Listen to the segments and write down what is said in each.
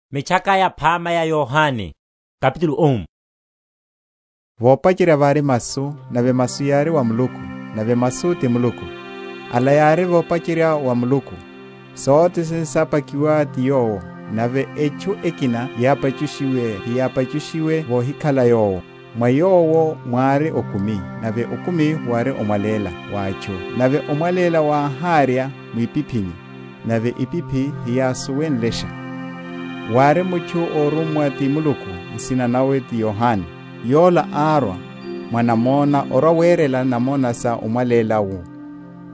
Oyariwa m’mwilini wa Masu. Vopacherya vári Masu, nave Masu yári wa Muluku, nave Masu ti Muluku. Ala yári vopacherya wa Muluku. Sothene sápakiwe ti Yowo; nave etchu ekina yápachushiwe heyápachushiwc vohikhala Yowo. Mwa Yowo mwári okumi; nave okumi wári omwaléla wa atchu. Nave omwaléla wáharya mwipiphini; nave epiphi heyásuwenlesha. Wári mutchu, órummwa ti Muluku, nsina nawe ti Yohane. Yola árwa mwa namona orwa‐werela namona sa omwaléla wu,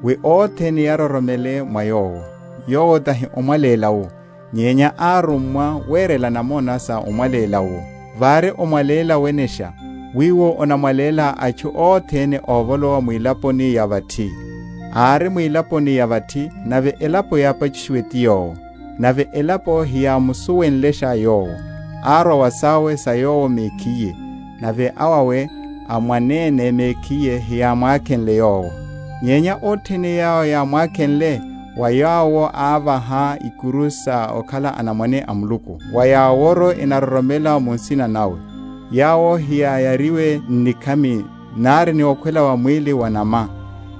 wi othene yaroromele mwa yowo. Yowo tahi omwaléla wu, nyenya árummwa werela namona sa omwaléla wu. Vári omwaléla wenesha, wiwo onamwaléla atchu othene óvolowa mwilaponi ya vathi. Ári mwilaponi ya vathi, nave elapo yápachushiwe ti Yowo, nave elapo heyámusuwenlesha Yowo. Árwa wa sawe sa Yowo mekhiye, nave awawe a mwanene mekhiye heyámwakhenle Yowo. Nyenya othene yawo yámwakhenle, wa yawo ávaha ikuru sa okhala anamwane a Muluku, wa yaworu enaroromela mu nsina nawe: yawo heyáyariwe n’nikhami, nari ni okhwela wa mwíli wa’nama,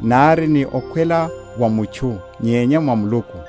nari ni okhwela wa mutchu, nyenya wa Muluku.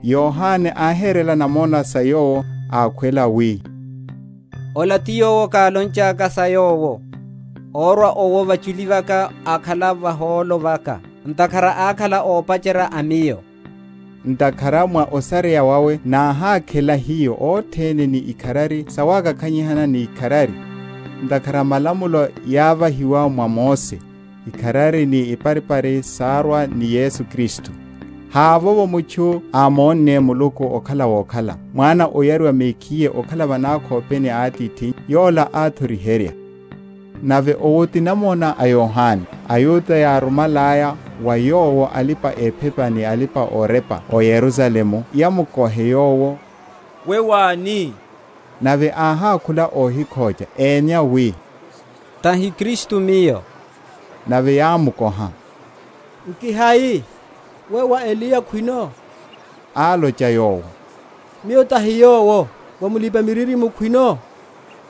Yohane áherela namona sa Yowo, akhuwela wi, Ola ti Yowo kálonchaka sa Yowo, Órwa owo vachuli vaka ákhala vahólo vaka; ntakhara ákhala ópacherya a miyo. Ntakhara mwa osareya wawe náhakhela hiyo othene, ni ikharari sawakakhanyihana ni ikharari. Ntakhara malamulo yávahiwa mwa Mose; ikharari ni iparipari sárwa ni Yesu Kristu. Havovo mutchu ámonne Muluku okhala wokhala; Mwana óyariwa mekhiye ókhala va nakhopeni a Atithi, Yola áthoriherya. Nave owo ti namona a Yohane, aYuda yárumalaya wa yowo alipa‐ephepa ni alipa‐orepa ó Yerusalemu yamukohe yowo, We wáni? Nave áhákhula, ohikhocha; emya wi, Tahi Kristu Miyo. Nave yámukoha, Nki hai? We wá Eliya khwino? Álocha yowo, Miyo tahi Yowo. Wá mulipa‐miririmo’wo khwino?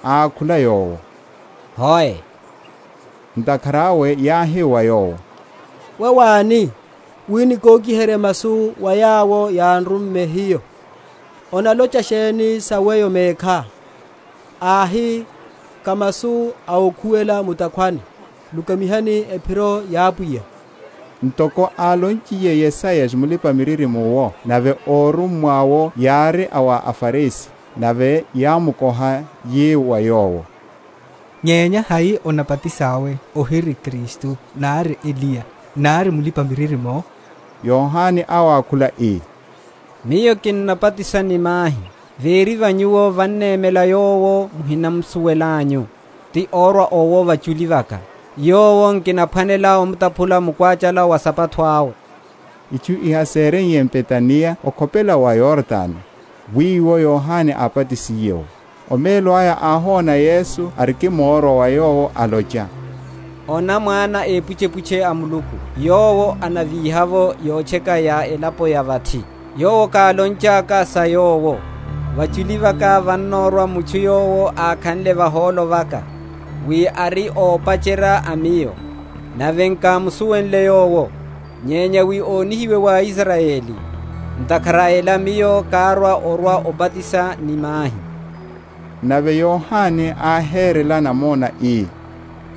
Ákhula yowo, Hoe. Ntakhara awe yáhi wa yowo, We wáni? wi nikokiherye masu wa yawo yán’rumme hiyo. Onalocha sheni sa weyo mekhá? Áhi, Ká masu a ókhuwela mu’takhwani, Lukamihani ephiro ya Pwiya, ntoko álonchiye Yesaya Mulipa‐miririmo’wo. Nave órummwa’wo yári a wa aFarisi. Nave yámukoha, yi wa yowo, Nyenya hai onabatisá, ohiri Kristu, nari Eliya, nari Mulipa‐miririmo? Yohane áwakhula, ii, Miyo kinnabatisa ni mahi: véri va nyuwo vannemela yowo muhinamusuwelanyu, ti órwa owo vachuli vaka, yowo nkinaphwanela omutaphulela mukwachala wa esapato awe. Itchu iha séreiye m’Betaniya okhopela wa Yordano, wiwo Yohane ábatisiye’wo. Omelo aya áhona Yesu arikimorwa wa yowo, alocha, Ona mwana a epuchepuche a Muluku yowo anavíha’vo yotcheka’ya ya elapo ya vathi! Yowo kálonchaka sa Yowo, Vachuli vaka vannorwa mutchu yowo ákhanle vahólo vaka: wi ári ópacherya a miyo. Nave nkámusuwenle Yowo; nyenya wi onihiwe wa Israyeli, ntakhara a ela miyo kárwa orwa‐obatisa ni mahi. Nave Yohane áherela namona, ii,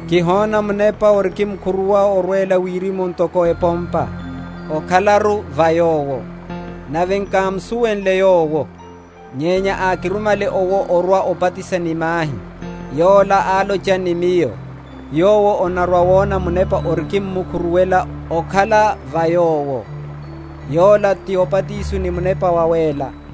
Kihona Munepa orikimkhuruwa orwela wirimu ntoko epompa; okhalaru va Yowo. Nave nkámusuwenle Yowo, nyenya ákirumale owo orwa‐obatisa ni mahi, yola álocha ni Miyo, Yowo onarwa‐wona Munepa orikimmukhu?-?ruwela, okhala va Yowo, yola tóbatisa ni Munepa Wawéla.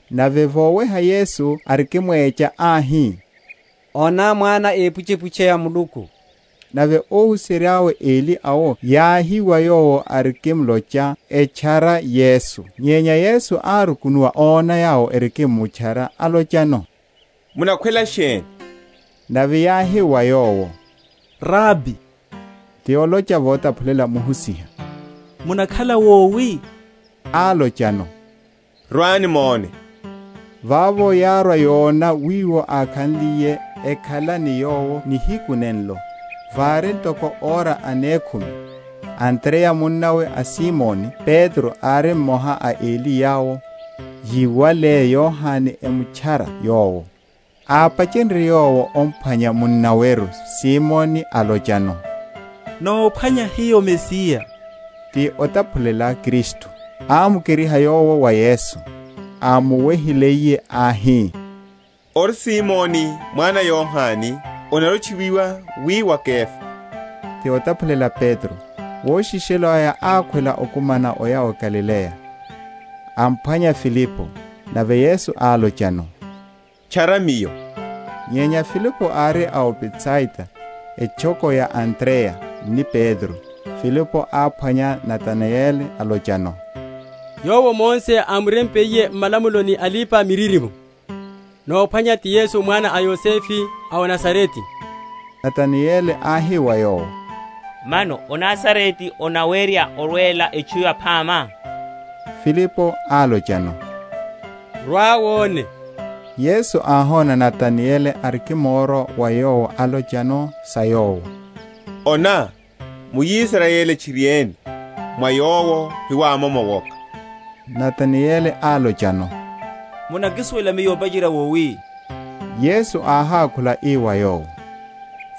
nave voweha Yesu arikimwecha, áhi, Ona Mwana a epuchepuche a Muluku! Nave óhuserya eli awo yáhiwa yowo arikimlocha, etchara Yesu. Nyenya Yesu árukunuwa, óna yawo erikimmutchara, alochano, Munakhwela sheni? Nave yáhi wa Yowo, Rabi (ti olocha votaphulela, Muhusiha), munakhala wowi? Álochano, Rwani mone. Vavo yárwa yona wiwo ákhaliye; ekhala ni Yowo nihiku nenlo: vári ntoko ora anekhumi. Andreya munnawe a Simoni Petro ári mmoha a eli yawo, yiwale Yohane, emutchara Yowo. Ápachenrye yowo ophwanya munnaweru, Simoni, alochano, Nóphwanya hiyo Mesiya (ti otaphulela Kristu). Ámukeriha yowo wa Yesu. Ámuwehiliye áhi, Ori Simoni mwana a Yohane, onarwa‐otchuwiwa wi wá Kefa (ti otaphulela Petro). Woshishelo aya ákhwela okhuma oya o Galileya, aphwanya Filipo. Nave Yesu álochano, Tchara Miyo. Nyenya Filipo ári a o Betsaida, etchoko ya Andreya ni Petro. Filipo áphwanya Natanayeli, alochano, Yowo Mose ámurempiye m’malamulo, ni alipa‐miririmo, nómphwanya, ti Yesu mwana a Yosefe a o Nazarete. Natanayeli áhi wa yowo, Mano o Nazarete onawerya orwela etchu yaphama? Filipo álochano, Rwa wone. Yesu áhona Natanayeli arikimorwa wa Yowo, alocha sa Yowo, Ona, muIsrayeli tchiriene, mwa yowo hemwamomo owoka! Natanayeli álochano, Munakisuwela miyo opacherya wowi? Yesu áhákhula ii wa yowo,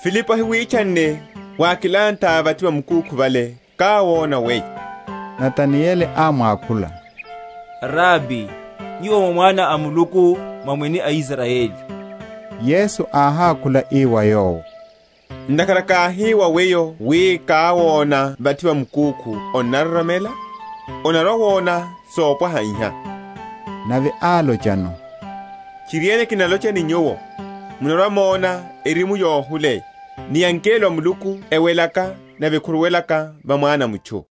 Filipo ahiwitchanne, wákilanthá vathi va mukúkhu vale, káwona weyo. Natanayeli ámwakhula, Rabi, Nyuwo mwá Mwana a Muluku, mwá mwene a Israyeli. Yesu áhákhula ii wa yowo, Ntakhara káhi wa weyo wi káwona vathi va mukúkhu onnaroromela? onarwa‐wona sopwaha iha. Nave álochano, Tchiriene, kinalocha ni nyuwo, munarwa‐mona erimu yohuleya, ni angelo a Muluku ewelaka nave ekhuruwelaka va Mwana a mutchu.